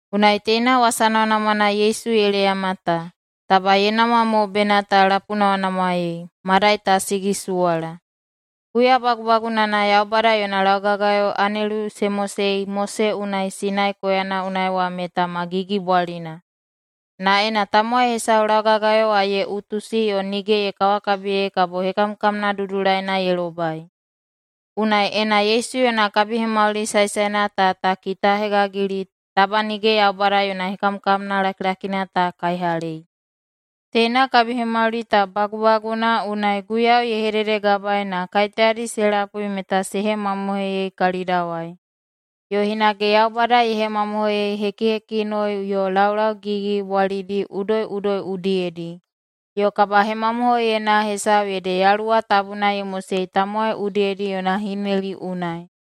Unai teina wasa namwanamwana Yesu ye leyama ta, taba ye namwa mo bena ta lapunamwanamwaei, madai ta sigisuwala. Huya bagubagunana Yaubada yona laugagayo anelu se mosei Mose unai Sinai koyana unai wa meta ma gigibwalina. Na ena tamowai hesau laugagayo wa ye utusi yo nige ye kawakabiyei kabo hekamkamna dudulaina ye lobai. Unai, ena Yesu yona kabihemauli saesaena ta ta kitahegagili, taba nige Yaubada yona hekamkamna lakilakina ta kaihalei! Teina kabihemauli ta bagubaguna unai Guiyau ye hededegabaei na kaiteyadi se lapui meta se hemamohoiyei kalidawai, yo hinage Yaubada ye hemamohoiyei hekihekinoi yo laulau gigigigibwalidi udoiꞌudoi udiyedi, yo kabahemamohoiyena hesau ede Yaluwa Tabuna ye mosei tamowai udiyedi yona hineli unai.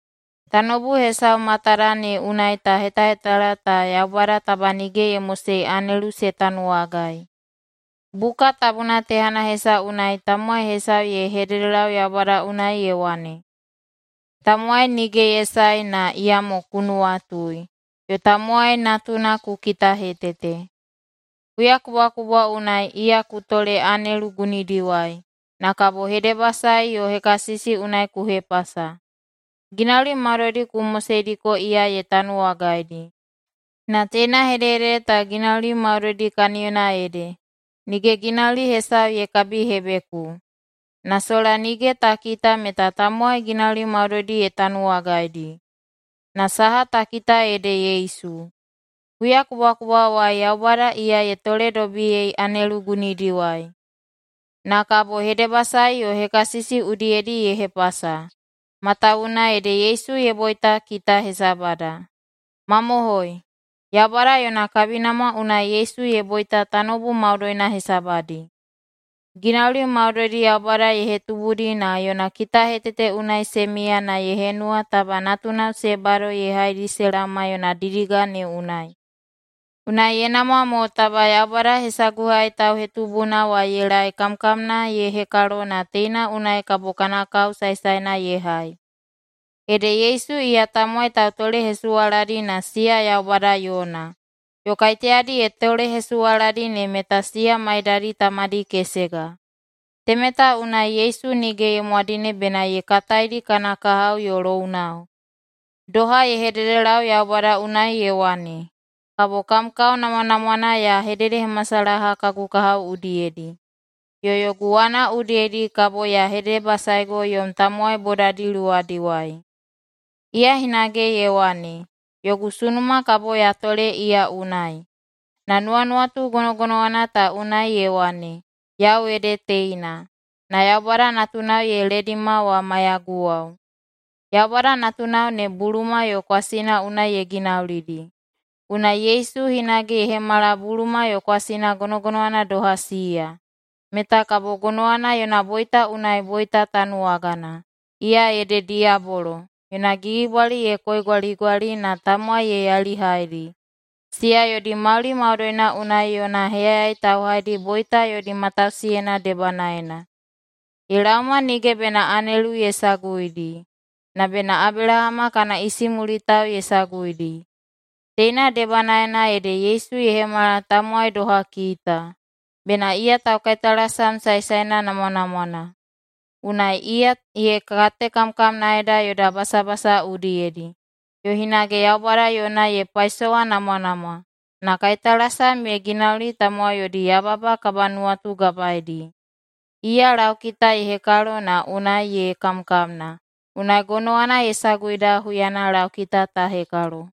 Tanoubu hesau matada ne unai ta hetahetala ta Yaubada taba nige ye mosei anelu se tanuwagai. Buka Tabuna tehana hesau unai tamowai hesau ye hededelau Yaubada unai ye wane, “Tamowai nige ye sae, na iyamo ku nuwatui, yo tamowai natuna ku kitahetete. Huyakubwakubwa unai iya ku tole anelu gunidiwai, na kabo hedebasae yo hekasisi unai ku hepasa. Ginauli maudoidi ku moseidiko iya ye tanuwagaidi.” Na teina hedehedede ta, “ginauli maudoidi”, kaniyona ede, “nige ginauli hesau ye kabihebeku”. Na sola nige ta kita meta tamowai ginauli maudoidi ye tanuwagaidi. Na saha ta kita ede Yesu. Huyakubwakubwawai Yaubada iya ye toledobiyei anelu gunidiwai, na kabo hedebasae yo hekasisi udiyedi ye hepasa, matawuwuna ede Yesu ye boita kita hesabada. Mamohoi, Yaubada yona kabinamwa unai Yesu ye boita tanoubu maudoina hesabadi. Ginauli maudoidi Yaubada ye hetubudi na yona kitahetete unai se miya na ye henuwa taba natunao se bado ye haidi se laoma yona didiga ne unai. Unai ye namwa mo taba Yaubada hesaguhai tauhetubuna wa ye laei kamkamna ye hekalo na teina unai kabo kana kao saesaena ye hai. Ede Yesu iya tamowai tautolehesuwaladi na siya Yaubada yona, yo kaiteyadi ye tolehesuwaladi ne meta siya maidadi tamadi kesega. Temeta unai Yesu nige ye mwadine bena ye kataidi kana kahao yo lounao. Doha ye hededelau Yaubada unai ye wane, “Kabo kam kao namwanamwana ya hededehemasalaha kagu kahao udiyedi. Yo yogu wana udiyedi kabo ya hedebasaego yom tamowai bodadi luwadiwai.” Iya hinage ye wane, “Yogu sunuma kabo ya tole iya unai.” Na nuwanuwatu gonogonowana ta unai ye wane, “Yau ede teina, na Yaubada natunao ye ledima wa maiyaguwao.” Yaubada natunao ne buluma yo kwasina unai ye ginaulidi, unai Yesu hinage ye hemala buluma yo kwasina gonogonowana doha siya, meta kabo gonowana yona boita unai boita tanuwagana, iya ede diyabolo, yona gigibwali ye koigwaligwali na tamowai ye yailihaidi, siya yodi mauli maudoina unai yona heyayai tauhaidi, boita yodi matausiyeina debanaena. Ye laoma nige bena anelu ye saguidi, na bena Abelahama kana isimulitao ye saguidi. Teina debanaena ede Yesu ye hemala tamowai doha kita, bena iya taukaitalasam saesaena namwanamwana. Unai iya ye katekamkamnaeda yoda basabasa udiyedi, yo hinage Yaubada yona ye paisowanamwanamwa, na kaitalasam ye ginauli tamowai yodi yababa kabanuwatugabaedi. Iya laukita ye hekalo na unai ye kamkamna, unai gonowana ye saguida huyana laukita ta hekalo.